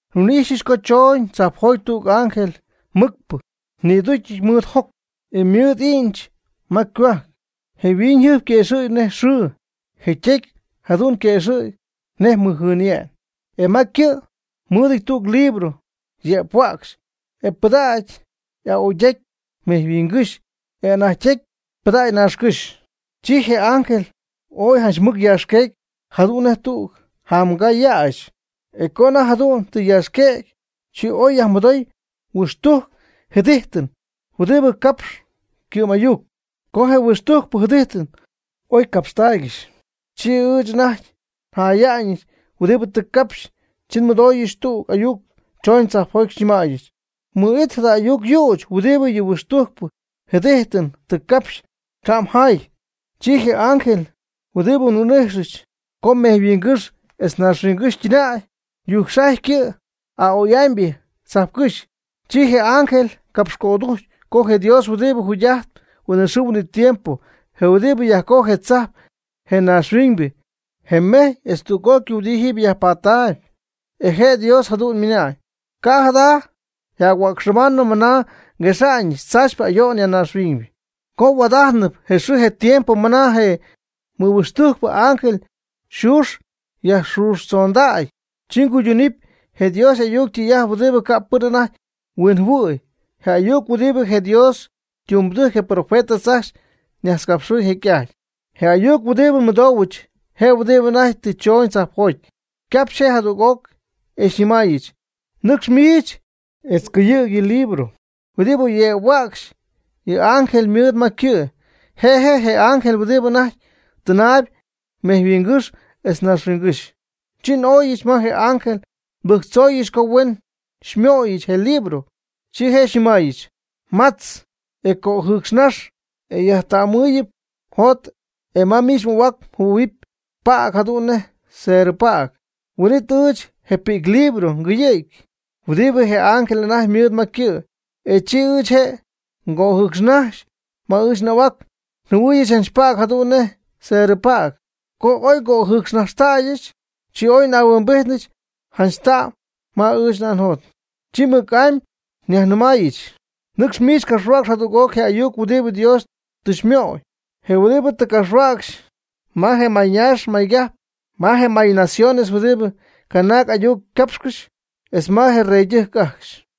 Nhuin'ijxyɨch co chooñ tzajpjoty tüg ángel mɨcpɨ ñïducyɨty mɨɨd joc, e mɨɨdɨty i'ñch ma ycohuajc. Je yhuiñyjɨjp yquëxɨ̈gy nej xɨɨ. Je' ytecy jadu'n yquëxɨ̈gy nej mɨjjɨɨnye'n. E ma ycɨ' mɨɨdɨty tüg libro yëphuäcxy, e pɨdacy y'a'oydecy mejyhuingɨ́xy, e y'anajtytecy pɨdacy naaxhuiñgɨ́xy. Chi je ángel oy janch mɨc yaaxquecy jadu'n nej tüg jamgaa yäxy. E co anajty jadu'n tɨ yaaxquëgy, chi oy yajmɨdoy huixtujc jɨdijtɨn huɨdibɨ ycapx ycɨ'm'ayuc. Co je huixtujcpɨ jɨdijtɨn oy ycapxtaaygɨxy, chi ɨɨch anajty njaaya'ñɨch huɨdibɨ tɨ capxy. Chi nmɨdooyɨch tüg ayuc chooñ tzajpjoty xyñɨmäyɨch: ―Mɨ'it jada ayuc yüch huɨdibɨ yɨ huixtujcpɨ jɨdijtɨn tɨ capxy, ca' mjaay. Chi je ángel huɨdibɨ nhuin'ijxɨch co mejyhuingɨ́xy etz naaxhuiñygɨ́xy ytɨnäy, yujcxajy ycɨ' a'oy'amybɨ tzajpcɨ́xy. Chi je ángel capxcödujcy co je Dios huɨdibɨ jugy'ajtp huinɨxɨɨ huinɨtiempo, je huɨdibɨ yajcojy je tzajp, je naaxhuiñybɨ, je mejy etz tüg'ócɨy huɨdibɨ jiiby yajpattaayb; e je Dios jadu'n ymɨna'ñ: ―Ca' jada yjac-huäcxɨbanɨ mɨna nguexa'ñɨch tzaachypɨ ayo'n ya naaxhuiñ. Co yhuaad'ajtnɨp je xɨɨ je tiempo ma anajty je mɨhuixtujcpɨ ángel yxuux yajxuxtzondägy, chi cuyduunɨp je Dios y'ayuc ytɨy'ajt huɨdibɨ ca'pɨn anajty huinjɨhuɨ̈y, je ayuc huɨdibɨ je Dios ytumbɨdɨjc je profetas ajcxy ñajtzcapxɨ̈y jecy'ajty. Je ayuc huɨdibɨ nmɨdoohuɨch, je huɨdibɨ anajty tɨ chooñ tzajpjoty, ycapxy je' jadüg'oc, e xyñɨmaayɨch: ―Nɨcx miich etz cɨyɨ̈g yɨ libro huɨdibɨ yëphuäcxy yɨ ángel ymɨɨd ma ycɨ'. Je' je' je ángel huɨdibɨ anajty tɨnaayb mejyhuingɨ́xy etz naaxhuiñygɨ́xy. Chi n'óyɨch ma je ángel nbɨjctzooyɨch co huen xymöyɨch je pi'clibro, chi je' xyñɨmaayɨch: ―Matz e cojɨɨcxnax, e xyajta'mmɨɨyɨp mjot e ma miich m'ahuac mjɨhuɨ̈huɨpy päg jadu'n nej cerɨpäg. Huin'it ɨɨch je pi'clibro ngɨyɨ̈gy huɨdibɨ je ángel anajty ymɨɨd ma ycɨ', e chi ɨɨch je' ngöjɨcxnajxy. Ma ɨɨch n'ahuac njɨhuɨɨyɨch janch päg jadu'n nej cerɨpäg. Co oy ngojɨɨcxnajxtäyɨch, chi oy y'ahuimbijtnɨ janch ta'm ma ɨɨch njot. Chi mɨc'amy nyajnɨmaayɨch: ―Nɨcx miich capxhuäcx jadüg'oc je ayuc huɨdibɨ Dios tɨ xymöy, je huɨdibɨ tɨ mgapxhuäcxy ma je mayñaax maygajp, ma je mayñaciones, huɨdibɨ canaag ayuc capxcɨxp, etz ma je reydɨjc ajcxy.